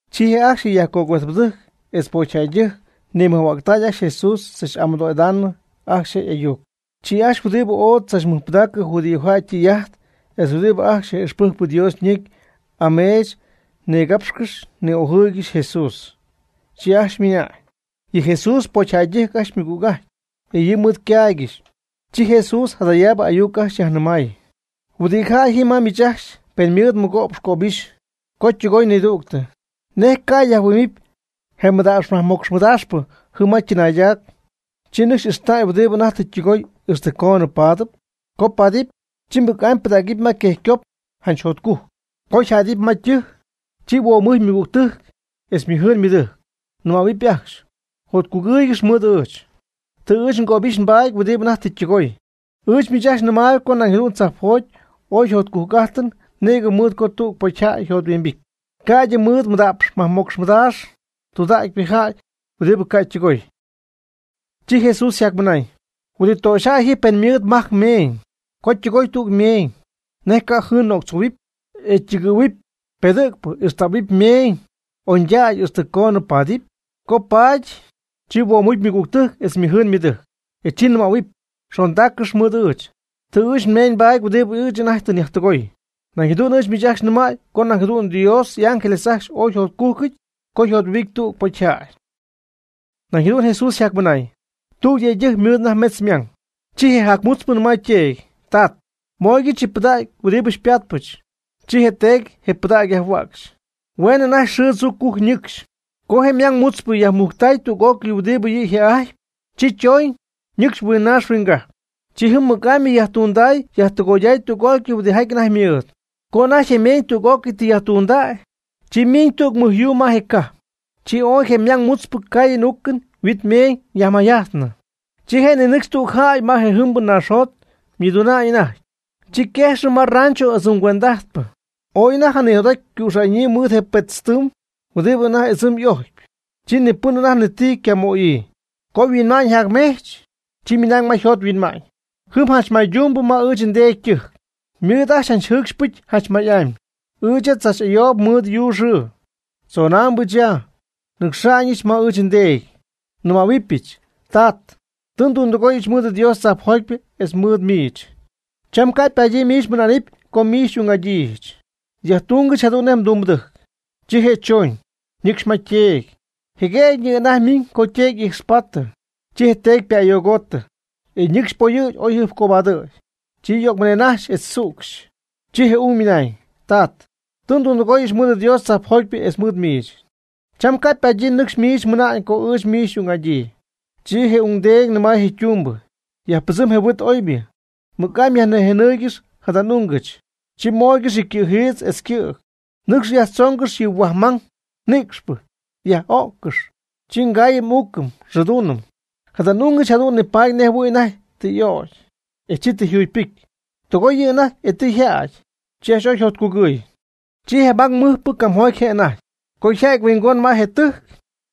Chi ajcxy je yajcuejtpɨdɨjc etz pocyjäydɨjc nimɨjhuägtay ajcxy Jesús tzach'amɨdoo'idaanɨ ajcxy je' y'ayuc. Chi ajcxy huɨdi ooy tzachmɨjpɨdägy judíojäy ytɨy'ajt etz huɨdi ajcxy yaj'ixpɨjc Dios ñecy ameech nigapxcɨxy ni'ojɨɨygɨxy je Jesús, chi ajcxy ymɨnañ: ―Yɨ Jesús pocyjäydɨjc ajcxy ymɨgüg'ajtpy, e yɨ' mɨɨd ycaaygɨxy. Chi Jesús jadayaabɨ ayuc ajcxy yajnɨmay: ―Huɨdi jäy ji ma miich ajcxy pen ymɨɨd mɨgo'px cöbixy co ytɨgoy nidügtɨ, ¿nej ca' yajhuɨ'mɨpy je mada'px majmocx mɨdaaxpɨ jɨm ma chɨnaaydac, chi nɨcxy ixtäy huɨdi anajty tɨ ytɨgoy ixtɨ coonɨ paadɨp? Co paadɨp, chi mɨc'amy pɨdägɨp ma quejycop janch jotcujc. Co yajjädɨp ma ytɨjc, chi huomucy ymɨgügtɨjc etz ymɨjɨɨn ymɨdɨjc, nɨmähuɨpy ajcxy: “Jotcugɨɨygɨx mɨɨd ɨɨch, tɨ ɨɨch ngöbixy nbaady huɨdi anajty tɨ ytɨgooy.” Ɨɨch miich ajcxy nɨmaayb co nañ jadu'n tzajpjoty ooy jotcujc'ájtɨn nïgɨ mɨɨd co tüg pocyjäy yjothuimbity, ca'ydɨ mɨɨd mada'px majmocx madaax tudägypɨ jäy huɨdi ca' ytundɨgoy. Chi Jesús yjacmɨnañ: ―¿Huɨdi töxyjäy ji pen ymɨɨd majc ymeeñ, co ytɨgooy tüg meeñ, nej ca' jɨɨn nöctzohuɨpy, e ytɨgɨ̈huɨpy pedɨ̈gpɨ ixtähuɨpy ymeeñ oñydägy ixtɨ coonɨ paadɨpy? Co paady, chi huomucy ymɨgügtɨjc etz ymɨjɨɨn ymɨdɨjc, e chi nɨmähuɨpy: “Xondaaccɨx mɨɨd ɨɨch, tɨ ɨɨch nmeeñ nbaty huɨdibɨ ɨɨch anajty tɨ nyajtɨgoy.” Jadu'n ɨɨch miich ajcxy nɨmäy co nañ jadu'n Dios y'ángeles ajcxy ooy yjotcújcɨty co yjothuimbity tüg pocyjäy. Nañ jadu'n Jesús yjacmɨnañ: ―Tüg yëydɨjc ymɨɨd anajty metz ymang. Chi je jacmutzpɨ nɨmay yteedy: “Tat, mooygɨch yɨ pɨdägy huɨdi xypaatpɨch.” Chi je' yteedy je pɨdägy yajhuäcxy. Hueenɨ anajty xɨɨ tzuu cujc ñɨcxy, co je' ymang mutzpɨ yajmujctay tüg'ócɨy huɨdi yɨ yjë'ajtpy, chi chooñ ñɨcxy huingnaax huinggajp. Chi jɨm mɨc'amy yajtunday yajtɨgoyday tüg'ócɨy huɨdi anajty ymɨɨd. Co anajty ymeeñ tüg'ócɨy yajtundäy, chi miiñ tüg mɨj yuu ma je cajp. Chi ooy je mang mutzpɨ caayɨn uucɨn huit meeñ jayajmayjajtnɨ. Chi je' ninɨcxy tüg jäy ma je jɨmbɨ naaxjot ymɨduna'ñ anajty. Chi yquejxɨ ma yrancho ɨdzɨm cuend'ajtpɨ. Ooy anajty janijot'aty ycüxa'ñyii mɨɨd je pëtztɨɨm huɨdi anajty ɨdzɨm y'ojcpy. Chi ni pɨn anajty ni ti ycamöyii. Co yhuinma'ñ yajmejch, chi ymɨnañ ma yjot yhuinma'ñ: “Jɨm janch maytumbɨ ma ɨɨch ndeedy ytɨjc, ymɨɨd ajcxy jɨɨcxy pɨcy janch may'amy. Ɨɨch ya tzach'ayoob mɨɨd yuu xɨɨ. Tzonaambɨch ya, nɨcxa'ñɨch ma ɨɨch ndeedy, nɨmähuɨbɨch: Tat, tɨ ndundɨgóyɨch mɨɨd Dios tzajpjotypɨ etz mɨɨd miich. Cham ca' ypadyii miich mɨna'nɨp co miich xy'ung'adyíijɨch. Yajtungɨch jadu'n nej mdumbɨdɨjc.” Chi je' choñ, ñɨcxy ma yteedy. Jeguëgyñɨ anajty ymiñ co yteedy y'ijxpaatɨ. Chi yteedy ypa'ayogotɨ, e ñɨcxy poyɨ̈gy oy jɨjpcobadɨ̈y. Chi yögmɨnennajxy etz tzücxy. Chi je ung ymɨnañ: “Tat, tɨ ndundɨgooyɨch mɨɨd Dios tzajpjotypɨ etz mɨɨd miich. Cham ca' ypadyii nɨcxy miich mɨna'ñ co ɨɨch miich xy'ung'adyii.” Chi je ungdeedy nɨmay je' ytumbɨ: “Yajpɨdzɨm je huit oybɨ, mɨc'amy yajnïjenɨɨygɨx jada n'ungɨch, chi mooygɨx yɨ cɨ̈jiitz etz ycɨ̈g. Nɨcx yajtzoongɨx yɨ huaj mang nïcxpɨ, yaj'öccɨx, chi ngaayɨm n'uucɨm e nxɨɨduunɨm. Jada n'ungɨch jadu'n nipaady nejjɨhuɨ̈y anajty tɨ y'ögy, e chi tɨ yjugypɨcy. Tɨgooy yɨ' anajty e tɨ yjädy.” Chi ajcxy ooy yjotcugɨɨy. Chi je ymang mɨjpɨ camjoty je' anajty. Co yja'ty mɨhuingon je ytɨjc,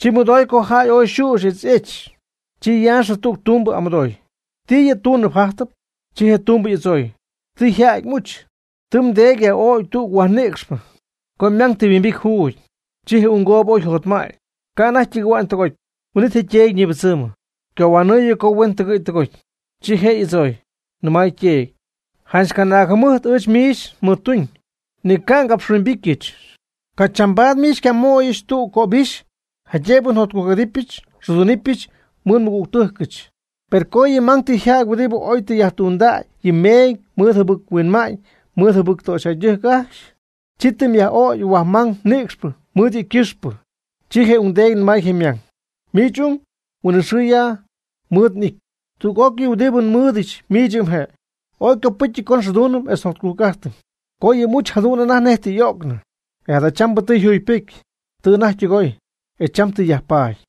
chi mɨdoy co jäy ooy yxüxy etz y'ech. Chi yaaxɨ tüg ytumbɨ y'amɨdooy: “¿Ti yɨ' túnɨp jájtɨp?” Chi je tumbɨ y'adzooy: “Tɨ yjädy m'uch, tɨ mdeedy yaj'ögy tüg huaj nïcxpɨ, co ymang tɨ huimbity juugy.” Chi je unggoob ooy yjotmäty, ca' anajty ytɨgɨ̈hua'ñ tɨgoty. Huin'it je yteedy ñibɨdzɨmɨ, ycohuanɨɨyɨ co huen tɨgɨ̈y tɨgoty. Chi je' y'adzooy, nɨmay yteedy: “Janch mɨcanaag jɨmɨjt ɨɨch miich mɨɨd nduñ, ni ca' ngapxhuimbityɨch. Ca' chambaad miich ni xycamooyɨch tüg pi'ccöbixy jaydëb njotcujc'adɨpyɨch nxɨɨdunɨpyɨch mɨɨd nmɨgügtɨjcɨch. Per co yɨ mmang tɨ yjädy huɨdi oy tɨ yajtundäy yɨ ymeeñ mɨɨd jɨbɨc-huinma'ñ mɨɨd jɨbɨc töxyjäydɨjc ajcxy, chi tɨ myaj'ögy huaj mang nïcxpɨ mɨɨd yɨ' ycɨxpɨ.” Chi je ungdeedy nɨmay je' ymang: “Miich ung huinɨxɨɨ ya mɨɨd n'ity. Tüg'ócɨy huɨdi nmɨɨdɨch miich yɨ' mje'. Ooy ycopɨ́cyɨty co nxɨɨduunɨm etz njotcugɨɨyɨm, co yɨ m'uch jadu'n anajty nej tɨ y'ögnɨ, e jadachambɨ tɨ yjugypɨcy, tɨ anajty ytɨgoy, e cham tɨ yajpaady.”